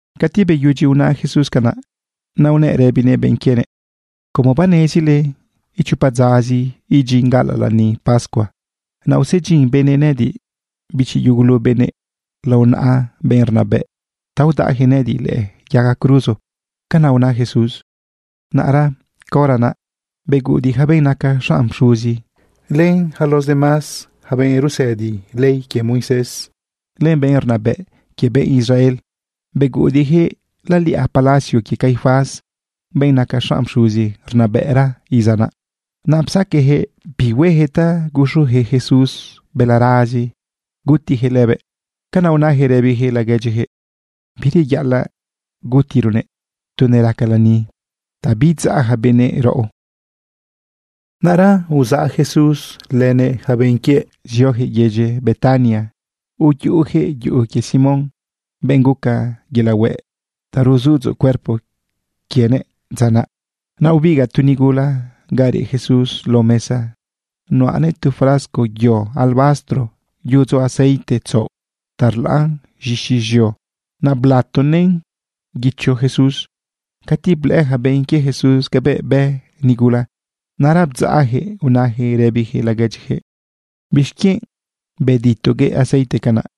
Cati beyudyi una Jesús canaꞌ, naꞌ unëꞌ rëbinëꞌ benꞌ quienëꞌ: ―Como banezile, ichopa dzazi idyin gaꞌalaꞌ lani pascua. Naꞌ usedyin benëꞌ nëꞌëdiꞌ, bichi yugulu benëꞌ, lao naꞌa benꞌ rnabëꞌ ta udaꞌjëꞌ nëꞌëdiꞌ lëꞌë yaga cruzo. ―Canaꞌ una Jesús. Naꞌra caora naꞌ, beguꞌudiꞌ ja benꞌ naca xanꞌ pxuzi, len yaca los demás benꞌ rusëdi ley quie Moisés, len benꞌ rnabëꞌ quie benꞌ Israel, beguꞌudiꞌjëꞌ laliꞌa palacio quie Caifás, benꞌ naca xanꞌ pxuzi rnabëꞌra iza naꞌ. Naꞌ psaqueꞌjëꞌ bi huejëꞌ ta guxujëꞌ Jesús balarazi gutijëꞌ lëbëꞌ. Canaꞌ unajëꞌ rëbijëꞌ laguedyijëꞌ: ―Bireyaꞌalaꞌ gutironëꞌ tu neraca lani ta biidzaꞌ ja benëꞌ raꞌo. Naꞌra uzaꞌ Jesús lënëꞌ yaca benꞌ quiëꞌ ziojëꞌ yedyi Betania uyuꞌujëꞌ yuꞌu quie Simón, benꞌ guca yelaꞌ hueꞌ ta ruzudzoꞌ cuerpo quienëꞌ dza naꞌ. Naꞌ ubigaꞌ tu nigula ga reꞌ Jesús lao mesa. Nuꞌ anëꞌ tu frasco yo alabastro yudzo aceite tzaoꞌ ta rlaꞌn z̃ixi z̃eo. Naꞌ blatonëꞌn guicho Jesús. Cati blëꞌë ja benꞌ quie Jesús cabëꞌ bë nigula, naꞌra bdzaꞌjëꞌ unajëꞌ rëbijëꞌ laguedyijëꞌ: ―¿Bixquienꞌ beditoguëꞌ aceite canaꞌ?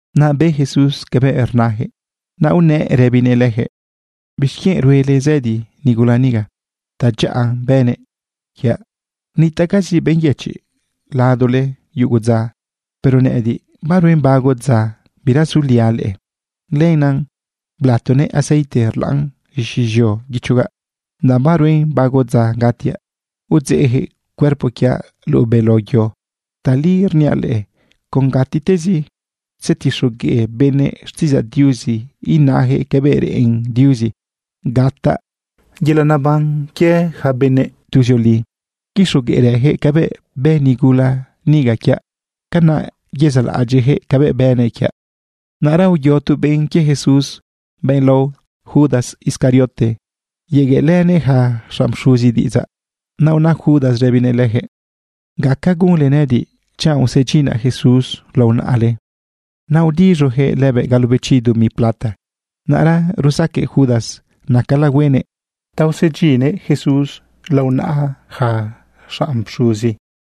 Naꞌ be Jesús cabëꞌ rnajëꞌ, naꞌ unëꞌ rëbinëꞌ lëjëꞌ: ―¿Bixquienꞌ ruele zëdi nigula niga? Tadyaꞌa bënëꞌ quiaꞌ. Nitaꞌcazi benꞌ yëchiꞌ ladole yugu dza. Pero nëꞌëdiꞌ, baruen bago dza bira suliaꞌ leꞌe. Lenaꞌ blatonëꞌ aceite rlaꞌn z̃ixi z̃eo guichogaꞌ, danꞌ baruen bago dza gatiaꞌ udzeꞌjëꞌ cuerpo quiaꞌ luꞌu beló yo. Tali rniaꞌ leꞌe, con gatitezi tzetixogueꞌ benëꞌ xtiꞌidzaꞌ Diuzi inajëꞌ cabëꞌ reꞌen Diuzi gataꞌ yelaꞌ neban quie yaca benëꞌ tuzioli, quixogueꞌrëjëꞌ cabëꞌ bë nigula niga quiaꞌ. Canaꞌ yezaꞌlaꞌadyiꞌjëꞌ cabëꞌ bënëꞌ quiaꞌ. Naꞌra uyo tu benꞌ quie Jesús, benꞌ lao Judas Iscariote, yegueꞌlënëꞌ ja xanꞌ pxuzi diꞌidzaꞌ. Naꞌ una Judas rëbinëꞌ lëjëꞌ: ―¿Gaca gunle nëꞌëdiꞌ chanꞌ usedyinaꞌ Jesús lao naꞌale? Naꞌ udiz̃ujëꞌ lëbëꞌ galobechi dumi plata. Naꞌra rusaqueꞌ Judas nacala huenëꞌ ta usedyinnëꞌ Jesús lao naꞌa ja xanꞌ pxuzi.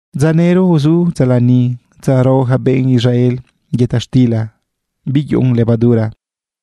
Dza nëro uzu dza lani, dza rao ja benꞌ Israel yëta xtila biyuꞌun levadura,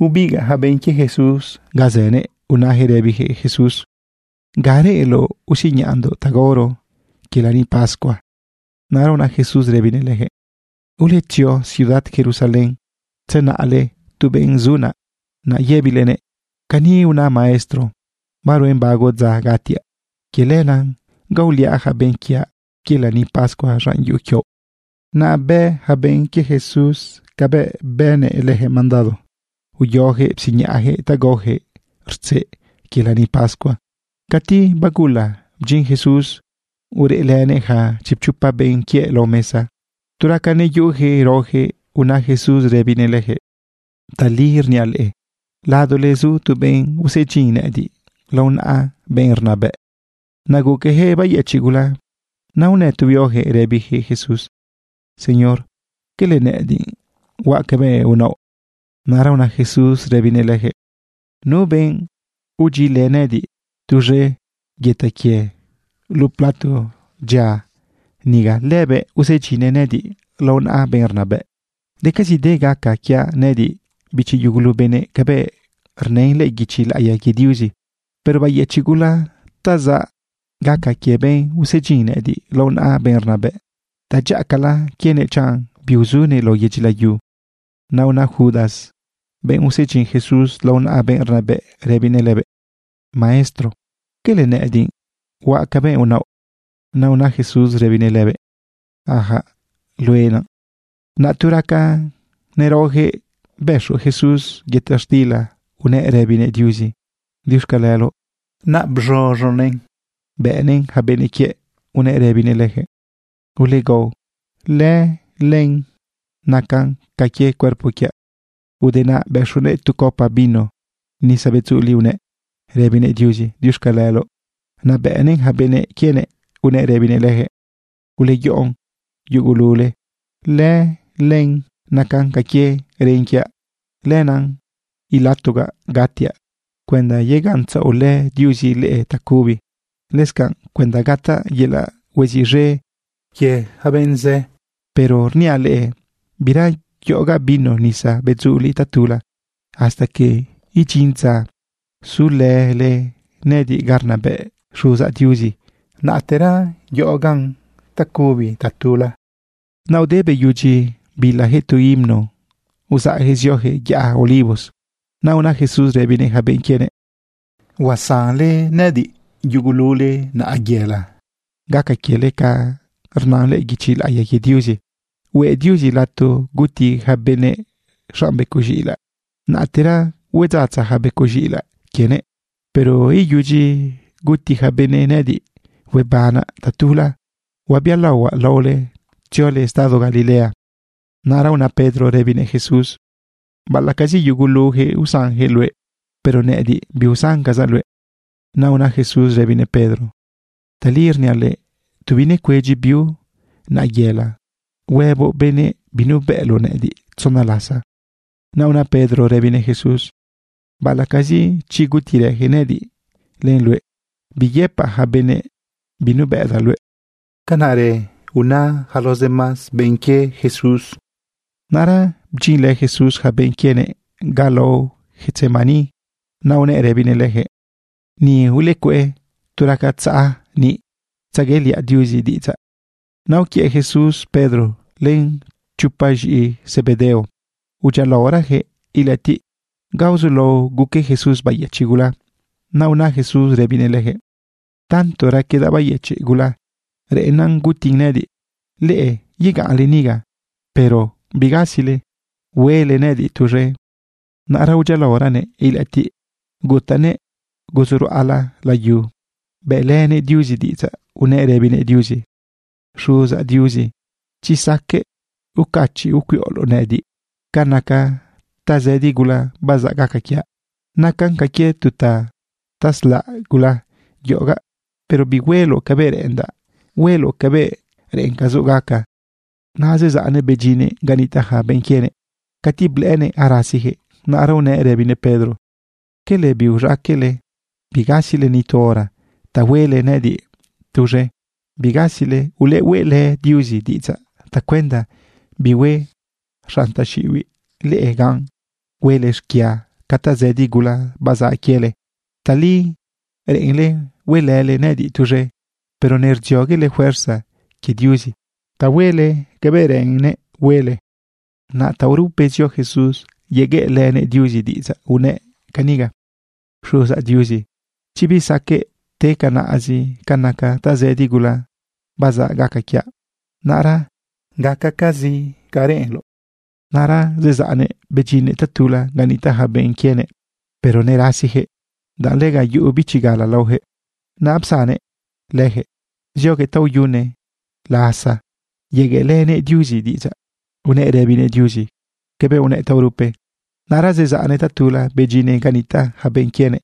bebigaꞌ ja benꞌ quie Jesús ga zënëꞌ unajëꞌ rëbijëꞌ Jesús: ―¿Ga reꞌenloꞌ usiñaꞌndoꞌ ta gaoro quie lani pascua? Naꞌ una Jesús rëbinëꞌ lëjëꞌ: ―Uletzio ciudad Jerusalén tzenaꞌle tu benꞌ zu naꞌ. Naꞌ yëbilenëꞌ: “Cani una maestro: Baruen bago dza gatiaꞌ. Quie lenaꞌ gaoliaꞌ ja benꞌ quiaꞌ quie lani pascua z̃an yuꞌu quioꞌ.” Naꞌ bë ja benꞌ quie Jesús cabëꞌ bënëꞌ lëjëꞌ mandado. Uyojëꞌ psiñaꞌjëꞌ ta gaojëꞌ rtzeꞌ quie lani pascua. Cati bagula, bdyin Jesús ureꞌlënëꞌ ja chipchopa benꞌ quiëꞌ lao mesa. Tu raca neyuꞌujëꞌ raojëꞌ, una Jesús rëbinëꞌ lëjëꞌ: ―Tali rniaꞌ leꞌe, ladole zu tu benꞌ usedyin nëꞌëdiꞌ lao naꞌa benꞌ rnabëꞌ. Naꞌ guquejëꞌ bayëchiꞌ gula. Naꞌ unë tu huiojëꞌ rëbijëꞌ Jesús: ―Señor, ¿quele nëꞌëdiꞌ huaꞌ cabëꞌ unaoꞌ? Naꞌra una Jesús rëbinëꞌ lëjëꞌ: ―Nu benꞌ udyilë nëꞌëdiꞌ tuz̃e yëta quie luꞌu plato dyia niga, lëbëꞌ usedyinnëꞌ nëꞌëdiꞌ lao naꞌa benꞌ rnabëꞌ. Decazide gaca quiaꞌ nëꞌëdiꞌ, bichi yugulu benëꞌ, cabëꞌ rnën lëꞌë guichi laꞌiya quie Diuzi. Pero bayëchiꞌ gula ta zaꞌ gaca quie benꞌ usedyin nëꞌëdiꞌ lao naꞌa benꞌ rnabëꞌ. Tadyaꞌacala quienëꞌ chanꞌ biuzunëꞌ lao yedyi layu. Naꞌ una Judas, benꞌ usedyin Jesús lao naꞌa benꞌ rnabëꞌ, rëbinëꞌ lëbëꞌ: ―Maestro, ¿quele nëꞌëdiꞌ huaꞌ cabëꞌ unaoꞌ? Naꞌ una Jesús rëbinëꞌ lëbëꞌ: ―Ajaꞌ, luëꞌ naꞌ. Naꞌ tu raca neraojëꞌ, bëxu Jesús yëta xtila unëꞌ rëbinëꞌ Diuzi: “Diuxcaleloꞌ.” Naꞌ bz̃uz̃unëꞌn bëꞌnëꞌn ja benꞌ quiëꞌ unëꞌ rëbinëꞌ lëjëꞌ: ―Ulegao, lëlen nacan ca quie cuerpo quiaꞌ. Ude naꞌ, bëxunëꞌ tu copa vino nisa bedzuliꞌ, unëꞌ rëbinëꞌ Diuzi: “Diuxcaleloꞌ.” Naꞌ bëꞌnëꞌn ja benꞌ quienëꞌ unëꞌ rëbinëꞌ lëjëꞌ: ―Uleyoꞌon yugulule. Lëlen nacan ca quie ren quiaꞌ. Lenaꞌ ilatogaꞌ gatiaꞌ cuenda yegaꞌntzaꞌolë Diuzi leꞌe tacubi, lëscanꞌ cuenda gataꞌ yelaꞌ hueziꞌz̃e quie yaca benꞌ zë. Pero rniaꞌ leꞌe, bira yoꞌogaꞌ vino nisa bedzuliꞌ tatula. Hasta que idyin dza zulële nëꞌëdiꞌ ga rnabëꞌ Xuzaꞌ Diuzi, naꞌtera yoꞌogaꞌ tacubi tatula. Naꞌ ude beyudyi bilajëꞌ tu himno, uzaꞌjëꞌ ziojëꞌ yaꞌa Olivos. Naꞌ una Jesús rëbinëꞌ ja benꞌ quienëꞌ: ―Huasanle nëꞌëdiꞌ yugulule naꞌayela. Gaca quiele ca rnan lëꞌë guichi laꞌiya quie Diuzi: “Hueꞌ Diuzi lato guti ja benëꞌ xanꞌ becoꞌ z̃iꞌilaꞌ, naꞌtera huedzatza ja becoꞌ z̃iꞌilaꞌ quienëꞌ.” Pero iyudyi guti ja benëꞌ nëꞌëdiꞌ, huebanaꞌ tatula, huabialaohuaꞌ laole tziole estado Galilea. Naꞌra una Pedro rëbinëꞌ Jesús: ―Baꞌalaꞌcazi yugulujëꞌ usanjëꞌ luëꞌ, pero nëꞌëdiꞌ, biusancazaꞌ luëꞌ. Naꞌ una Jesús rëbinëꞌ Pedro: ―Tali rniaꞌ luëꞌ, tu binecuedyi biu naꞌayela, huëboꞌ benëꞌ binubëꞌloꞌ nëꞌëdiꞌ tzona lasa. Naꞌ una Pedro rëbinëꞌ Jesús: ―Baꞌalaꞌcazi chi gutirëjëꞌ nëꞌëdiꞌ len luëꞌ, biyëpaꞌ ja benëꞌ binubëꞌdaꞌ luëꞌ. Canaꞌrë una yaca los demás benꞌ quie Jesús. Naꞌra bdyinlë Jesús ja benꞌ quienëꞌ ga lao Getsemaní, naꞌ unëꞌ rëbinëꞌ lëjëꞌ: ―Ni ulecueꞌ tu raca tzaꞌa niꞌ tzegueꞌliaꞌ Diuzi diꞌidzaꞌ. Naꞌ uquiëꞌ Jesús Pedro len chopa z̃iꞌi Zebedeo, udyialaorajëꞌ ilëꞌëtiꞌ ga uzulao guque Jesús bayëchiꞌ gula. Naꞌ una Jesús rëbinëꞌ lëjëꞌ: ―Tanto raquedaꞌ bayëchiꞌ gula, reꞌennan gutin nëꞌëdiꞌ. Leꞌe yegaꞌnle niga, pero bigasile huele nëꞌëdiꞌ tuz̃e. Naꞌra udyialaoranëꞌ ilëꞌëtiꞌ gutanëꞌ guzu ruꞌala layu, bëꞌlënëꞌ Diuzi diꞌidzaꞌ unëꞌ rëbinëꞌ Diuzi: ―Xuzaꞌ Diuzi, chi saqueꞌ ucachiꞌ ucuiꞌoloꞌ nëꞌëdiꞌ ca naca tazëdi gula bazaꞌ gaca quiaꞌ. Nacan ca quie tu taslaꞌ gula yoꞌogaꞌ. Pero bihueloꞌ cabëꞌ reꞌendaꞌ, hueloꞌ cabëꞌ reꞌencazoꞌ gaca. Naꞌ zezaꞌnëꞌ bedyinnëꞌ ga nitaꞌ ja benꞌ quienëꞌ. Cati blëꞌënëꞌ arasijëꞌ, naꞌra unëꞌ rëbinëꞌ Pedro: ―¿Quele biuz̃aqueꞌle bigasile ni tu hora ta huele nëꞌëdiꞌ tuz̃e? Bigasile. Ulehueꞌlë Diuzi diꞌidzaꞌ tacuenda bihue xanꞌ taxiꞌibiꞌ leꞌe gan huele xquia ca tazëdi gula bazaꞌ quiele. Tali reꞌenle huelële nëꞌëdiꞌ tuz̃e, pero nerdzioguele fuerza quie Diuzi ta huele cabëꞌ reꞌenle huele. Naꞌ taorupe zio Jesús yegueꞌlënëꞌ Diuzi diꞌidzaꞌ unëꞌ caniga: ―Xuzaꞌ Diuzi, chi bisaqueꞌ te canaꞌzi ca naca tazëdi gula bazaꞌ gaca quiaꞌ, naꞌra gacacazi ca reꞌenloꞌ. Naꞌra zezaꞌnëꞌ bedyinnëꞌ tatula ga nitaꞌ ja benꞌ quienëꞌ, pero nerasijëꞌ, danꞌ lega yuꞌu bichi gala laojëꞌ. Naꞌ psannëꞌ lëjëꞌ zioguëꞌ taoyune lasa yegueꞌlënëꞌ Diuzi diꞌidzaꞌ. Unëꞌ rëbinëꞌ Diuzi cabëꞌ unëꞌ taorupe. Naꞌra zezaꞌnëꞌ tatula bedyinnëꞌ ga nitaꞌ ja benꞌ quienëꞌ.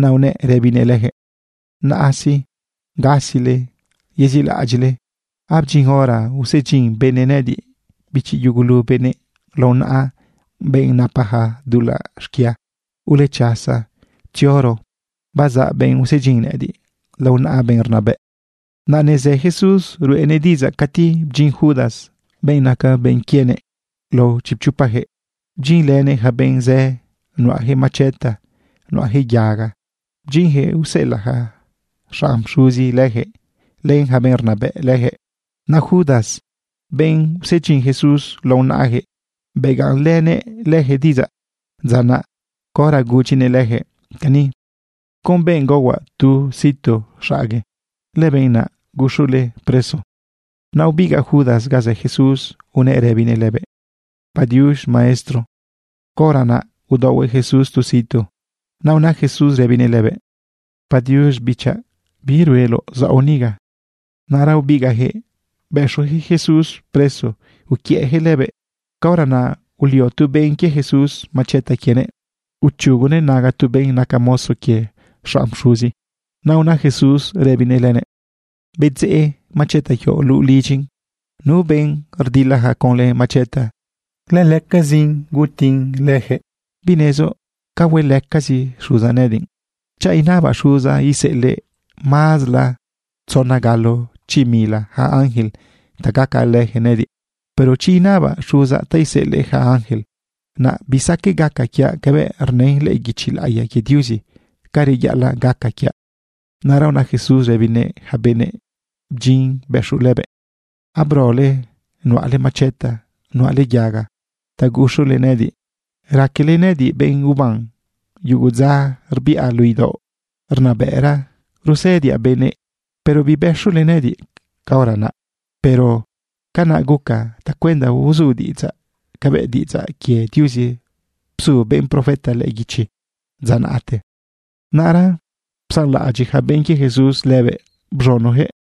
Naꞌ unëꞌ rëbinëꞌ lëjëꞌ: ―Naꞌa sí, gasile yeziꞌlaꞌadyiꞌle. Abdyin hora usedyin benëꞌ nëꞌëdiꞌ, bichi yugulu benëꞌ, lao naꞌa benꞌ napaja dulaꞌ xquia. Ulechasa, tzioro. Bazaꞌ benꞌ usedyin nëꞌëdiꞌ lao naꞌa benꞌ rnabëꞌ. Naꞌ nezë Jesús ruꞌenëꞌ diꞌidzaꞌ cati bdyin Judas, benꞌ naca benꞌ quienëꞌ lao chipchopajëꞌ. Bdyinlënëꞌ ja benꞌ zë nuꞌajëꞌ macheta, nuꞌajëꞌ yaga. Bdyinjëꞌ useꞌelaꞌ ja xanꞌ pxuzi len ja benꞌ rnabëꞌ lëjëꞌ. Naꞌ Judas, benꞌ usedyin Jesús lao naꞌajëꞌ, begaꞌnlënëꞌ lëjëꞌ diꞌidzaꞌ dza naꞌ caora gudyinëꞌ lëjëꞌ cani: ―Con benꞌ gaohuaꞌ tu situ xaꞌague, lëbenꞌ naꞌ guxule preso. Naꞌ ubigaꞌ Judas ga zë Jesús unëꞌ rëbinëꞌ lëbëꞌ: ―¡Padiux, Maestro! Caora naꞌ udaohuëꞌ Jesús tu situ. Naꞌ una Jesús rëbinëꞌ lëbëꞌ: ―Padiux, bichaꞌ. ¿Bi rueloꞌ zaoꞌ niga? Naꞌra ubigaꞌjëꞌ bëxujëꞌ Jesús preso uquiëꞌjëꞌ lëbëꞌ. Caora naꞌ ulio tu benꞌ quie Jesús macheta quienëꞌ, uchugunëꞌ naga benꞌ naca mozo quie xanꞌ pxuzi. Naꞌ una Jesús rëbinëꞌ lënëꞌ: ―Bedzeꞌ macheta quioꞌ luꞌu lidyin. Nu benꞌ rdilaja conlë macheta, lëlëcazin gutin lënëꞌ. ¿Binezoꞌ ca huelëcazi Xuzaꞌ nëꞌëdiꞌ? Chanꞌ inabaꞌ xuzaꞌ, iseꞌelëꞌ mazla tzona galo chi mila ja ángel ta gacalëjëꞌ nëꞌëdiꞌ. Pero chi inabaꞌ xuzaꞌ ta iseꞌelëꞌ ja ángel, naꞌ bisaqueꞌ gaca quiaꞌ cabëꞌ rnën lëꞌë guichi laꞌiya quie Diuzi ca reyaꞌalaꞌ gaca quiaꞌ. Naꞌra una Jesús rëbinëꞌ ja benꞌ bdyin bëxu lëbëꞌ: ―¿Abrole nuꞌale macheta, nuꞌale yaga, ta guxule nëꞌëdiꞌ? ¿Raquele nëꞌëdiꞌ benꞌ uban? Yugu dza rbiꞌa luꞌu idaoꞌ rnabëꞌra rusëdiaꞌ benëꞌ, pero bibëxule nëꞌëdiꞌ caora naꞌ. Pero canaꞌ guca tacuenda uzu diꞌidzaꞌ cabëꞌ diꞌidzaꞌ quie Diuzi bzu benꞌ profeta lëꞌë guichi dza naꞌte. Naꞌra psanlaꞌadyiꞌ ja benꞌ quie Jesús lëbëꞌ bz̃unojëꞌ.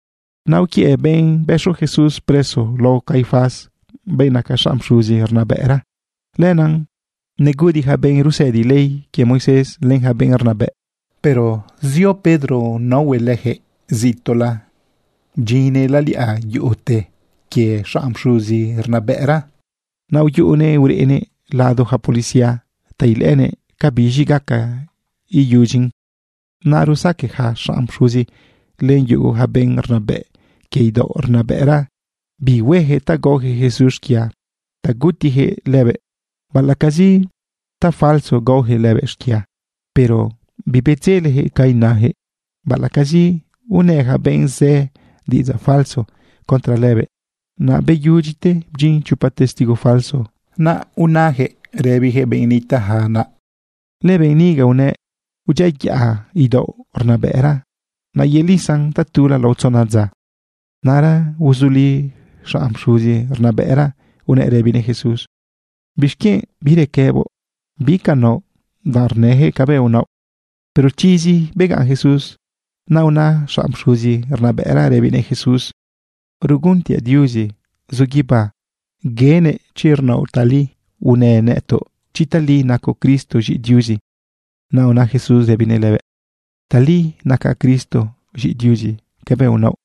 Naꞌ uquiëꞌ benꞌ bëxu Jesús preso lao Caifás, benꞌ naca xanꞌ pxuzi rnabëꞌra. Lenaꞌ neguꞌudiꞌ ja benꞌ rusëdi ley quie Moisés, len ja benꞌ rnabëꞌ. Pero zio Pedro naohuëꞌ lëjëꞌ zituꞌla, bdyinnëꞌ laliꞌa yuꞌute quie xanꞌ pxuzi rnabëꞌra. Naꞌ uyuꞌunëꞌ ureꞌnëꞌ lado ja policía ta ilëꞌënëꞌ cabiz̃i gaca iyudyin. Naꞌ rusaqueꞌ ja xanꞌ pxuzi, len yugu ja benꞌ rnabëꞌ quie idaoꞌ rnabëꞌra bi huejëꞌ ta gaojëꞌ Jesús xquia ta gutijëꞌ lëbëꞌ, baꞌalaꞌcazi tafalso gaojëꞌ lëbëꞌ xquia. Pero bibedzelejëꞌ ca inajëꞌ, baꞌalaꞌcazi unë ja benꞌ zë diꞌidzaꞌ falso contra lëbëꞌ. Naꞌ beyudyite bdyin chopa testigo falso. Naꞌ unajëꞌ rëbijëꞌ benꞌ nitaꞌja naꞌ: ―Lëbenꞌ niga unëꞌ: “Udyiayaꞌa idaoꞌ rnabëꞌra, naꞌ yelisaꞌn tatula lao tzona dza.” Naꞌra uzuli xanꞌ pxuzi rnabëꞌra, unëꞌ rëbinëꞌ Jesús: ―¿Bixquienꞌ birequëboꞌ? ¿Bi ca naoꞌ danꞌ rnëjëꞌ cabëꞌ unaoꞌ? Pero chizi begaꞌn Jesús. Naꞌ una xanꞌ pxuzi rnabëꞌra rëbinëꞌ Jesús: ―Rguntiaꞌ Diuzi zu guibá, guenëꞌ chi rnaoꞌ tali. Unë nëtoꞌ chi tali nacoꞌ Cristo, z̃iꞌi Diuzi. Naꞌ una Jesús rëbinëꞌ lëbëꞌ: ―Tali nacaꞌ Cristo, z̃iꞌi Diuzi, cabëꞌ unaoꞌ.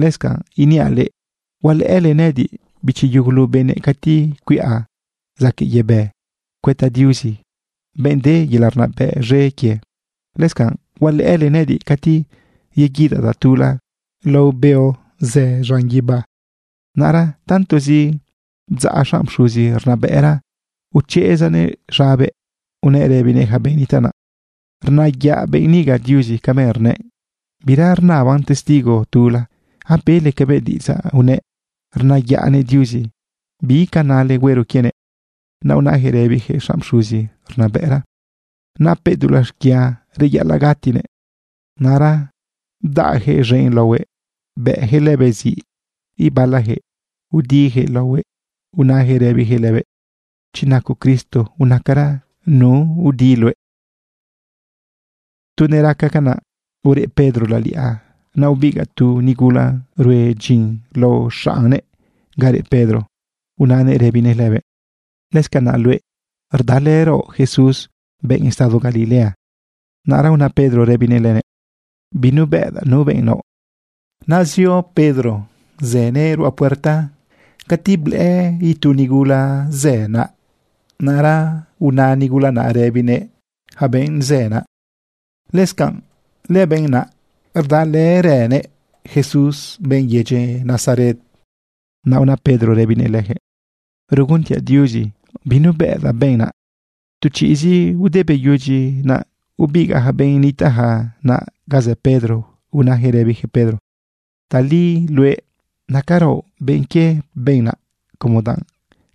Lëscanꞌ iniaꞌ leꞌe, hualëꞌële nëꞌëdiꞌ, bichi yugulu benëꞌ, cati cuiꞌa zaquëꞌ yebë cuëta Diuzi, benꞌ de yelaꞌ rnabëꞌ z̃e quie. Lëscanꞌ hualëꞌële nëꞌëdiꞌ cati yeguidaꞌ tatula lao beo zë z̃an guibá. Naꞌra tantozi bdzaꞌ xanꞌ pxuzi rnabëꞌra, uchezanëꞌ z̃abëꞌ unëꞌ rëbinëꞌ ja benꞌ nitaꞌ naꞌ: ―Rnayaꞌ benꞌ niga Diuzi cabëꞌ rnëꞌ. Bira rnaban testigo tula. Abele cabëꞌ diꞌidzaꞌ unëꞌ rnayaꞌnëꞌ Diuzi. ¿Bi ca nale huero quienëꞌ? Naꞌ unajëꞌ rëbijëꞌ xanꞌ pxuzi rnabëꞌra: ―Napëꞌ dulaꞌ xquia, reyaꞌalaꞌ gatinëꞌ. Naꞌra bdaꞌjëꞌ z̃enꞌ laohuëꞌ, bëꞌjëꞌ lëbëꞌ ziꞌ. Ibalajëꞌ udijëꞌ laohuëꞌ, unajëꞌ rëbijëꞌ lëbëꞌ: ―Chi nacoꞌ Cristo, unacara nu udi luëꞌ. Tu neraca canaꞌ, ureꞌ Pedro laliꞌa. Naꞌ ubigaꞌ tu nigula rue dyin lao xaꞌne ga reꞌ Pedro unanëꞌ rëbinëꞌ lëbëꞌ: ―Lëscanaꞌ luëꞌ, rdalëraoꞌ Jesús, benꞌ estado Galilea. Naꞌra una Pedro rëbinëꞌ lënëꞌ: ―Binubëꞌdaꞌ nu benꞌ naoꞌ. Naꞌ zio Pedro zënëꞌ ruꞌa puerta cati blëꞌë itu nigula zë naꞌ. Naꞌra una nigula naꞌ rëbinëꞌ ja benꞌ zë naꞌ: ―Lëscanꞌ lëbenꞌ naꞌ rdalërënëꞌ Jesús, benꞌ yedyi Nazaret. Naꞌ una Pedro rëbinëꞌ lëjëꞌ: ―Ruguntiaꞌ Diuzi binubëꞌdaꞌ benꞌ naꞌ. Tu chiꞌzi ude beyudyi naꞌ, ubigaꞌ ja benꞌ nitaꞌja naꞌ ga zë Pedro, unajëꞌ rëbijëꞌ Pedro: ―Tali luëꞌ nacaraoꞌ benꞌ quie benꞌ naꞌ como danꞌ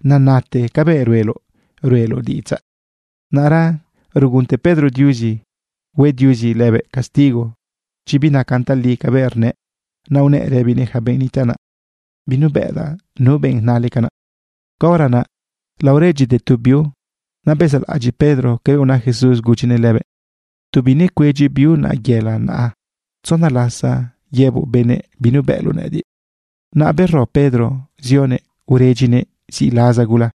nenate cabëꞌ rueloꞌ ruꞌeloꞌ diꞌidzaꞌ. Naꞌra rugunte Pedro Diuzi hue Diuzi lëbëꞌ castigo chi binacan tali cabëꞌ rnëꞌ. Naꞌ unëꞌ rëbinëꞌ ja benꞌ nitaꞌ naꞌ: ―Binubëꞌdaꞌ nu benꞌ nale canaꞌ. Caora naꞌ laoredyite tu biu. Naꞌ bezaꞌlaꞌadyiꞌ Pedro cabëꞌ una Jesús gudyinëꞌ lëbëꞌ: “Tu binecuedyi biu naꞌayela, naꞌ tzona lasa yëboꞌ benëꞌ binubëꞌloꞌ nëꞌëdiꞌ.” Naꞌ bero Pedro zionëꞌ uredyinëꞌ ziꞌlaza gula.